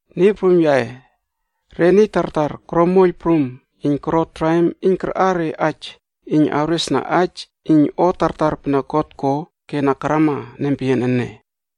Niy prum yaꞌe, re niy tartar koro moiyl prum iyn koro traim iyn karꞌar re aij iyn awresna aij iyn o tartar pene God ko ke na karama nempeyian ene.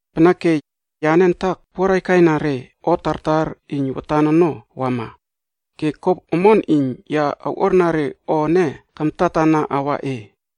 Peneke, yane antak puaraiykaiyna re o tartar iyn watan ono wama, ke ko omon iyn ya awꞌuarna re o ene kamtatana awa e,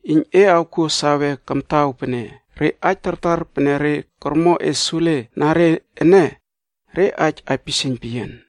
iyn e awkuo sawe kamtaw pene re aij tartar pene re kormo e sule na re ene, re aij aipisieiyn peyian.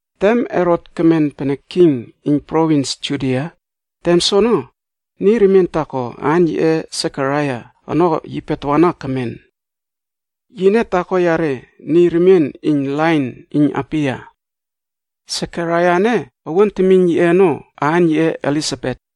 Tem Herot kemen pene king iyn provins Judia, tem soono, niy remien taako aan yiꞌe Sekaraia ono yipe tawana kemen. Yine taako yare niy remien iyn lain iyn Abiya. Sekaraia ene owuan temiyn yiꞌe ono, aan yiꞌe Elisabet.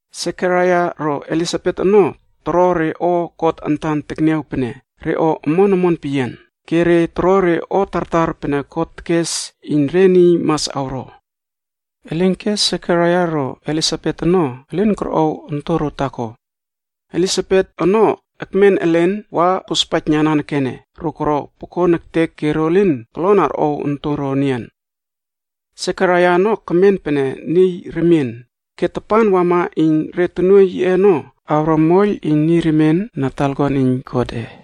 Sekaraia ro Elisabet ono toro re o God antan tekniaw pene re o omon omon peyian, ke ro toro re o tartar pene Niy Prum tekes iyn re niy mas awro. Elinke Sekaraia ro Elisabet ono elin korꞌow ontoro taako. Elisabet ono ekmen elen wa kospaijna nanekene ro koro pokon ektek ke ro lin kolon arꞌow ontoro enian. Sekaraia ono kemen pene niy remien, ke tapan wama iyn re tonuoiy yiꞌe ono awro moiyl niy remien na talakuan iyn Godꞌe,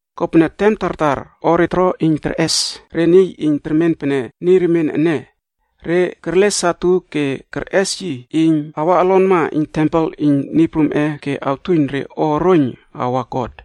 Kopene tem tartar o re toro iyn terꞌes re niy iyn termen pene niy remien ene, re kerle satu ke kerꞌes yi iyn awa olonma iyn tempel iyn Niy Prumꞌe ke awtuiyn re o oroiyn awa God.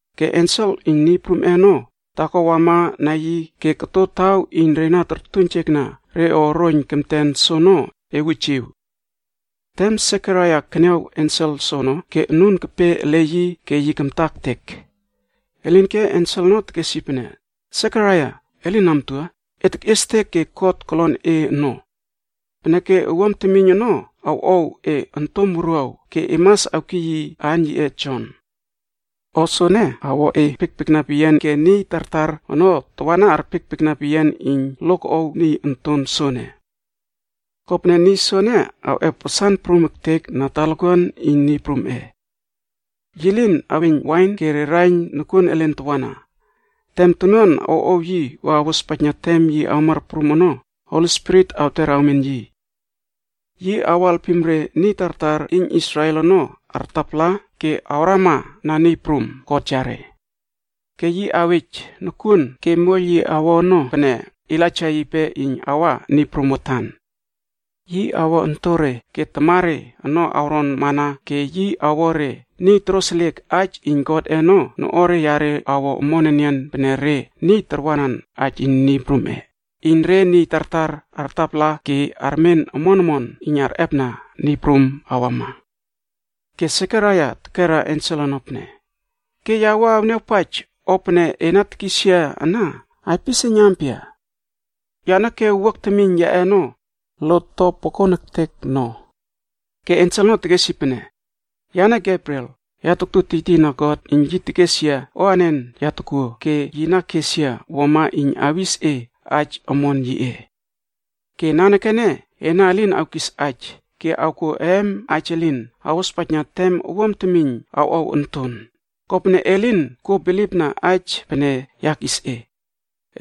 Ke ensel iyn Niy Prumꞌe ono, taako wamana yi ke koto taw iyn tortuiynjekna re o oroiyn kemten ono, ewujiw. Tem Sekaraia keniaw ensel soono ke anun kepe ele yi ke yi kamta ektek. Elinke ensel ono tekes yi pene, “Sekaraia, e lin amtua, e tekꞌiestek ke God kolon e ono. Peneke owuam temiyn ono awꞌow e ontom wuruaw ke e mas awkiy yi aan yiꞌe Jon. O soene awo e arpiekpiekna peyian ke niy tartar ono tawana arpiekpiekna peyian iyn lo koꞌow niy onton soene. Kopene niy soene awꞌep wasan prum ektek na talakuan iyn Niy Prumꞌe. Yi lin aweiyn wain ke re raiyn nokuon elen tawana. Tem tonuan awꞌow yi wa awospaijna tem yi awmar prum ono, Holi Spirit awter awmen yi. Yi awo alpim re niy tartar iyn Israel ono artapala ke awrama na Niy Prum God yare. Ke yi awej nokuon ke moiyl yi awo ono pene Elaija yipe iyn awa Niy Prum watan. Yi awo ontore ke tamare ono awron mana ke yi awo re niy toroseliek aij iyn Godꞌe ono noꞌuare yare awo omon enian pene re niy tarwanan aij iyn Niy Prum, iyn re niy tartar artapala ke armen omon omon iyn arꞌepna Niy Prum awama.” Ke Sekaraia tekera ensel ono pene, “Ke ya awniawpaij o pene e na tekis yia ana aipisieiyn ampia? Yane ke owuak temiyn yaꞌe ono, lot to pokon ektek no.” Ke ensel ono tekes yi pene, “Yane Gebriel, ya taktu tiytiyna God iyn yi tekes yia o anen ya tokuo ke yi na kes yia wuama iyn awis e aij omon yiꞌe. Ke nanekene ena elin awkis aij ke awkuo eem aij elin awospaijna tem owuam temiyn awꞌow onton, kopene e lin kuo bilipna aij pene ya kis e.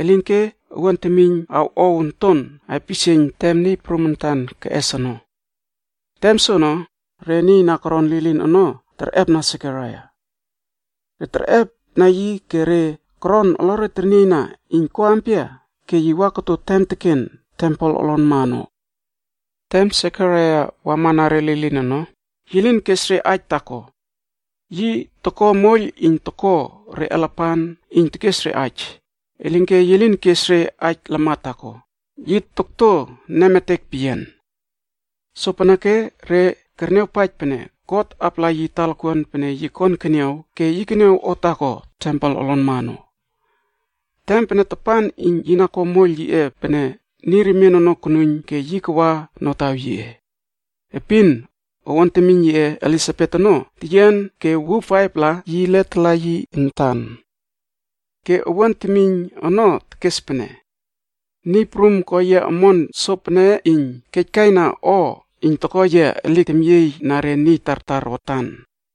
Elinke owuam temiyn awꞌow onton aipisieiyn tem Niy Prum antan keꞌes ono.” Tem soono, re niy na koron lilin ono terꞌepna Sekaraia. Re terꞌepna yi ke re koron olore ternieyna iyn ko ampia ke yi wa koto tem teken tempel olonma ono. Tem Sekaraia wama na re lilin ono, yi lin kes re aij taako. Yi toko moiyl iyn toko re alapan iyn tekes re aij, elinke yi lin kes re aij lamat taako, yi tokto nemetek peyian. Sopeneke re kerniawpaij pene God apala yi talakuan pene yi kon keniaw ke yi keniaw o taako tempel olonma ono. Tem pene tapan iyn yi na ko moiyl yiꞌe pene niy remien ono konuiyn ke yi kawa notaw yiꞌe. Epin, owuan temiyn Elisabet ono teyian ke wuw faiv-pla yi letala yi antan. Ke owuan temiyn ono tekes pene, “Niy Prum ko yia omon sopene iyn kejkaina o iyn toko yia elik temyieyna re niy tartar watan.”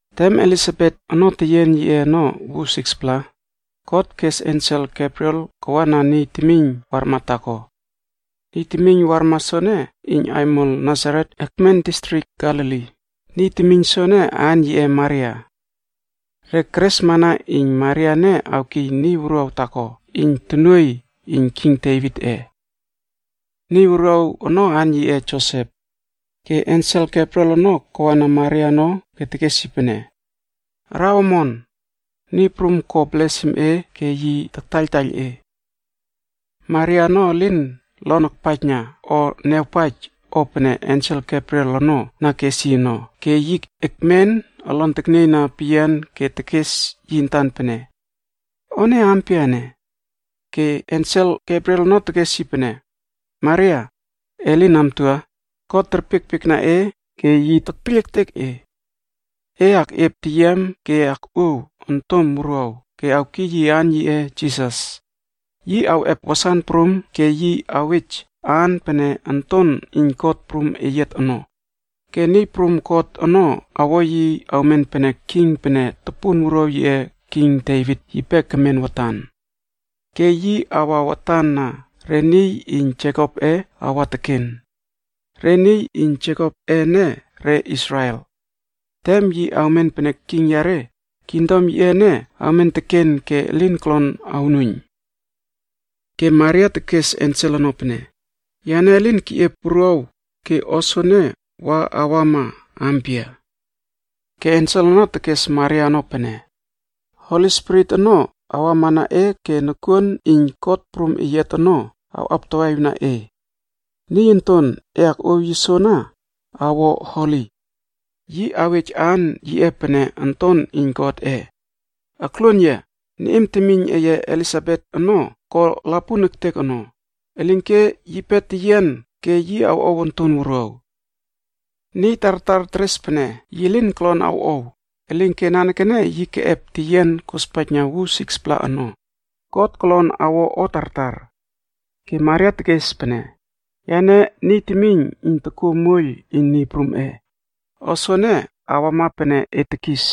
Tem Elisabet ono teyian yiꞌe ono wuw 6-pla, God kes ensel Gebriel kawana niy temiyn warma taako. Niy temiyn warma soene iyn aimol Nasaret ekmen distrik Galili. Niy temiyn soene aan yiꞌe Maria. Re keresmana iyn Maria ene awkiy niy wuruaw taako iyn tonuoiy iyn king Devitꞌe. Niy wuruaw ono aan yiꞌe Josep. Ke ensel Gebriel ono kawana Maria ono ke tekes yi pene, “Araw omon! Niy Prum ko blesim e ke yi taktaiyltaiyl e.” Maria ono elin lon akpaijna o niawpaij o pene ensel Gebriel ono na kes yi ono ke yi ekmen olon teknieyna peyian ke tekes yi antan pene, “O ene ampia ene?” Ke ensel Gebriel ono tekes yi pene, “Maria, e lin amtua, God espaij e ke yi terpiekpiekna e. E akꞌiep teyiam ke e akꞌuow ontom wuruaw ke awkiy yi aan yiꞌe Jisas. Yi awꞌep wasan prum ke yi awej aan pene Onton Iyn God Prum Eyiat ono. Ke Niy Prum God ono awo yi awmen pene king pene topun wuruaw yiꞌe king Devit yipe kemen watan. Ke yi awa watan na re niy iyn Jekopꞌe awa teken. Re niy iyn Jekopꞌe ene re Israel. Tem yi awmen pene king yare, kingdom yiꞌe ene awmen teken ke elin kolon awnuiyn.” Ke Maria tekes ensel ono pene, “Yane elin keꞌiep wuruaw ke o soene wa awama ampia?” Ke ensel ono tekes Maria ono pene, “Holi Spirit ono awama na e ke nokuon iyn God Prum Eyiat ono awꞌaptawaꞌiwna e. Niy onton e akꞌuow yi soana awo Holi. Yi awej aan yiꞌe pene Onton Wuruaw Iyn Godꞌe. Akluon yia, niꞌim temiyn eye Elisabet ono ko lapun ektek ono, elinke yipe teyian ke yi awꞌow onton wuruaw. Niy tartar teres pene yi lin kolon awꞌow, elinke nanekene yi keꞌep teyian kospaijna wuw 6-pla ono. God kolon awo o tartar.” Ke Maria tekes pene, “Yane niy temiyn iyn tokuo moiyl iyn Niy Prumꞌe. O soene awama pene e tekis.”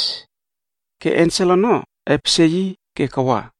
Ke ensel ono epesie yi ke kawa.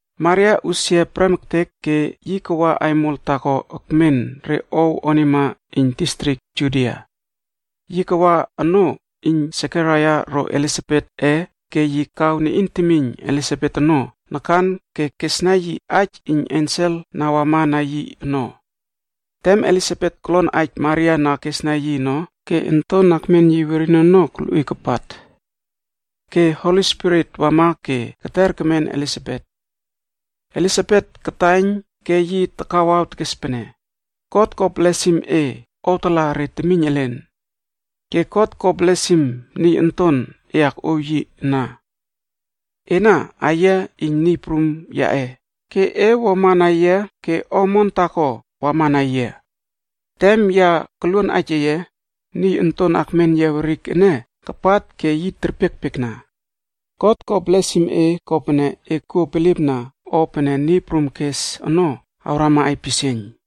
Maria usia prem ektek ke yi kawa aimol taako ekmen re ow onima iyn distrik Judia. Yi kawa onoo iyn Sekaraia ro Elisabetꞌe ke yi kaw niꞌin temiyn Elisabet ono nakan ke kesna yi aij iyn ensel na wama na yi ono. Tem Elisabet kolon aij Maria na kesna yi ono, ke onton akmen yi werin ono kolꞌuiy kapat. Ke Holi Spirit wama ke keter kemen Elisabet. Elisabet kataiyn ke yi takawaw tekes pene, “God ko blesim e owtala re temiyn elen. Ke God ko blesim niy onton e akꞌuow yi ana. Ena aiyia iyn Niy Prum yaꞌe, ke e wuama na yia ke o omon taako wama na yia. Tem ya koluon aij eye, niy onton akmen yia werik ene kapat ke yi kerpiekpiekna. God ko blesim e kopene e kuo bilipna o pene Niy Prum kes ono awrama aipisieiyn.”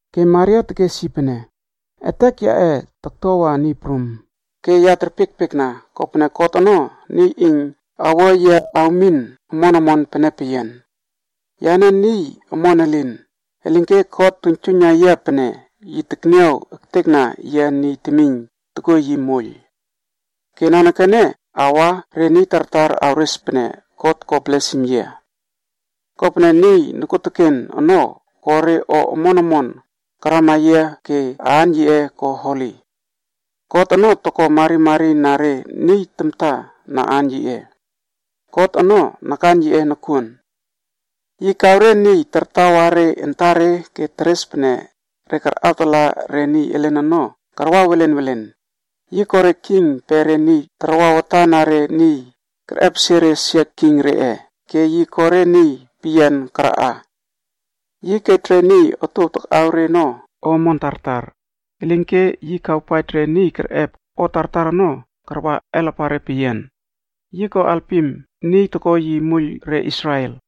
Ke Maria tekes yi pene: “Etek yaꞌe taktuawa Niy Prum, ke ya terpiekpiekna, kopene God ono niy iyn awo yia awmin omon omon pene peyian. Yane niy omon elin, elinke God tuiynjuiyna yia pene yi tekniaw ektekna yia niy temiyn tokuo yi moiyl. Ke nanekene awa re niy tartar awres pene God ko blesim yia. Kopene Niy Nokuoteken ono ko re o omon omon karama yia ke aan yiꞌe ko Holi. God ono toko marimari na re niy tamta na aan yiꞌe. God ono nakan yiꞌe nokuon. Yi kaw re niy tartawa re antare ke teres pene re karꞌawtala re niy elen ono karwa welen welen. Yi ko re king pe re niy tarwa watan na re niy, kerꞌepesie re sia king reꞌe ke yi ko re niy peyian karaꞌa. Yi kej re niy otuow takꞌaw re ono o omon tartar, elinke yi kawpaij re niy kerꞌep o tartar ono karwa alapare peyian. Yi ko alpim niy toko yi moiyl re Israel,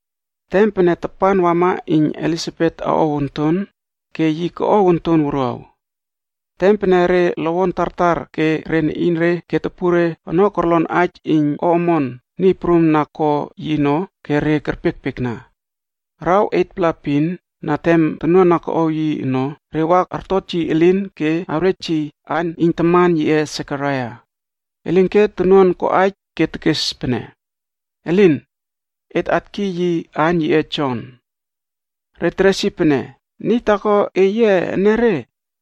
Tem pene tapan wama iyn Elisabet awꞌow onton, ke yi koꞌow onton wuruaw. Tem pene re lowon tartar ke re niꞌinre ke topunre ono korlon aij iyn o omon Niy Prum na ko yi ono ke re kerpiekpiekna. Araw 8-pla epin na tem tonuan na koꞌow yi ono, re wa artot yi elin ke awrej yi aan iyn taman yiꞌe Sekaraia. Elinke tonuan koꞌaij ke tekes pene, “Elin! Et atkiy yi aan yiꞌe Jon.” Re teres yi pene, “Niy taako eye enere,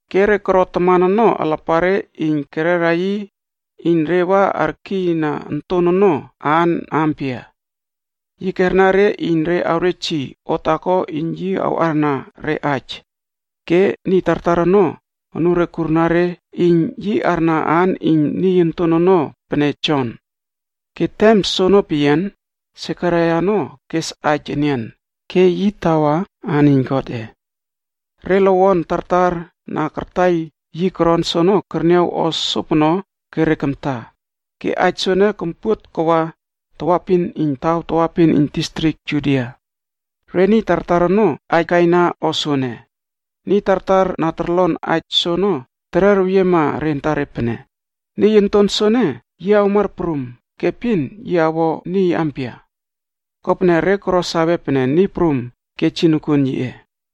Ke re koro taman ono alapare iyn kererna yi iyn re wa arkiyna onton ono aan ampia. Yi kerna re iyn re awrej yi o taako iyn yi awꞌarna re aij, ke niy tartar ono anure kurna re iyn yi arna aan iyn niy onton ono pene Jon. Ke tem soono peyian, Sekaraia ono kes aij enian, ke yi tawa aan iyn Godꞌe. Re lowon tartar na kartaiyl yi koron soono kerniaw o sopono ke re kamta. Ke aij soene kompuot kawa tawaepin iyn taw tawaepin iyn distrik Judia. Re niy tartar ono aij kaina o soene. Niy tartar na torlon aij soono tererweyiema re antare pene, “Niy onton soene yi awmar prum ke epin yi awo niy ampia?” Kopene re koro sawe pene Niy Prum kej yi nokuon yiꞌe.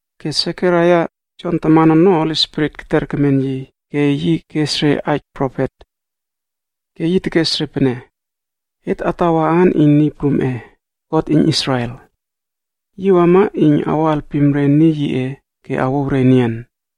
Ke Sekaraia, Jon taman ono Holi Spirit keter kemen yi ke yi kes re aij profet. Ke yi tekes re pene: “Et atawa aan iyn Niy Prumꞌe, God iyn Israel. Yi wama iyn awo alpim re niy yiꞌe ke awouw re enian.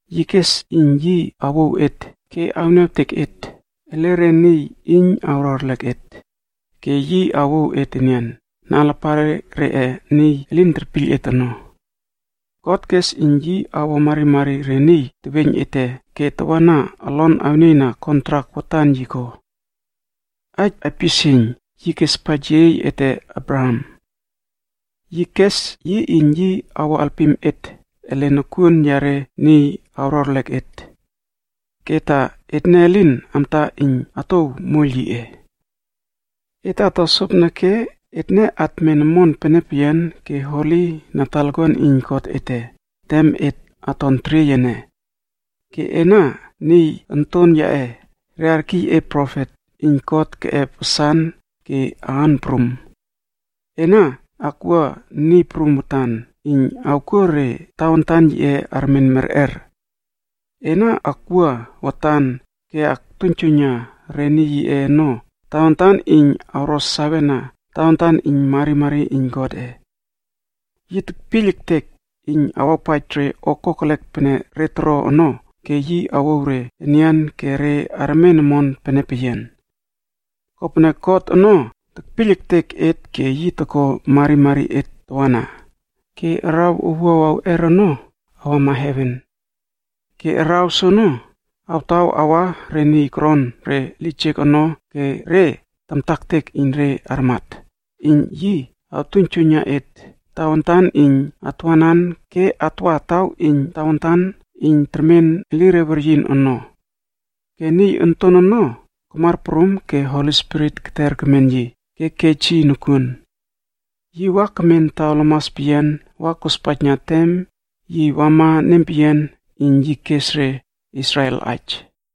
Yi kes iyn yi awouw et ke awniawtek et ele re niy iyn awro erlek et, ke yi awouw et enian na alapare reꞌe niy elin terpiyl et ono. God kes iyn yi awo marimari re niy teweiyn ete ke tawana olon awnieyna kontrak holi pene watan yi ko ono ka. Aij aipisieiyn yi kespaij yeyiey ete Abraham. Yi kes yi iyn yi awo alpim et ele nokuon yare niy awro erlek et. Ke ta etne lin amta iyn atouw moiyl yiꞌe. Et ato sopeneke etne atmen omon peyian ke holi na talakuan iyn God ete tem et aton teriey ene. Ke ena niy onton yaꞌe, re arkiy e profet iyn God keꞌep wasan ke aan prum. Ena akwua Niy Prum watan iyn awkuo re tawantan yiꞌe armen merꞌer. Ena akwua watan ke aktuiynjuiyna re niy yiꞌe ono tawantan iyn awro sawena tawantan iyn marimari iyn Godꞌe. Yi tekpiyl ektek iyn awawpaij re o kokelek pene re toro ono ke yi awouw re enian ke re armen omon pene peyian. Kopene God ono tekpiyl ektek et ke yi toko marimari et tawana, ke araw owuaw awꞌer ono awama heven. Ke araw soono awtaw awa re niy koron re lijek ono ke re tamta ektek iyn re armat, iyn yi awtuiynjuiyna et tawantan iyn atwanan ke atwa taw iyn tawantan iyn termen elire weryin ono.” Ke niy onton ono kamar prum ke Holi Spirit keter kemen yi ke kej yi nokuon. Yi wa kemen taw lamas peyian re niy elin toron wa kospaijna tem yi wama nempeyian iyn yi kes re Israel aij.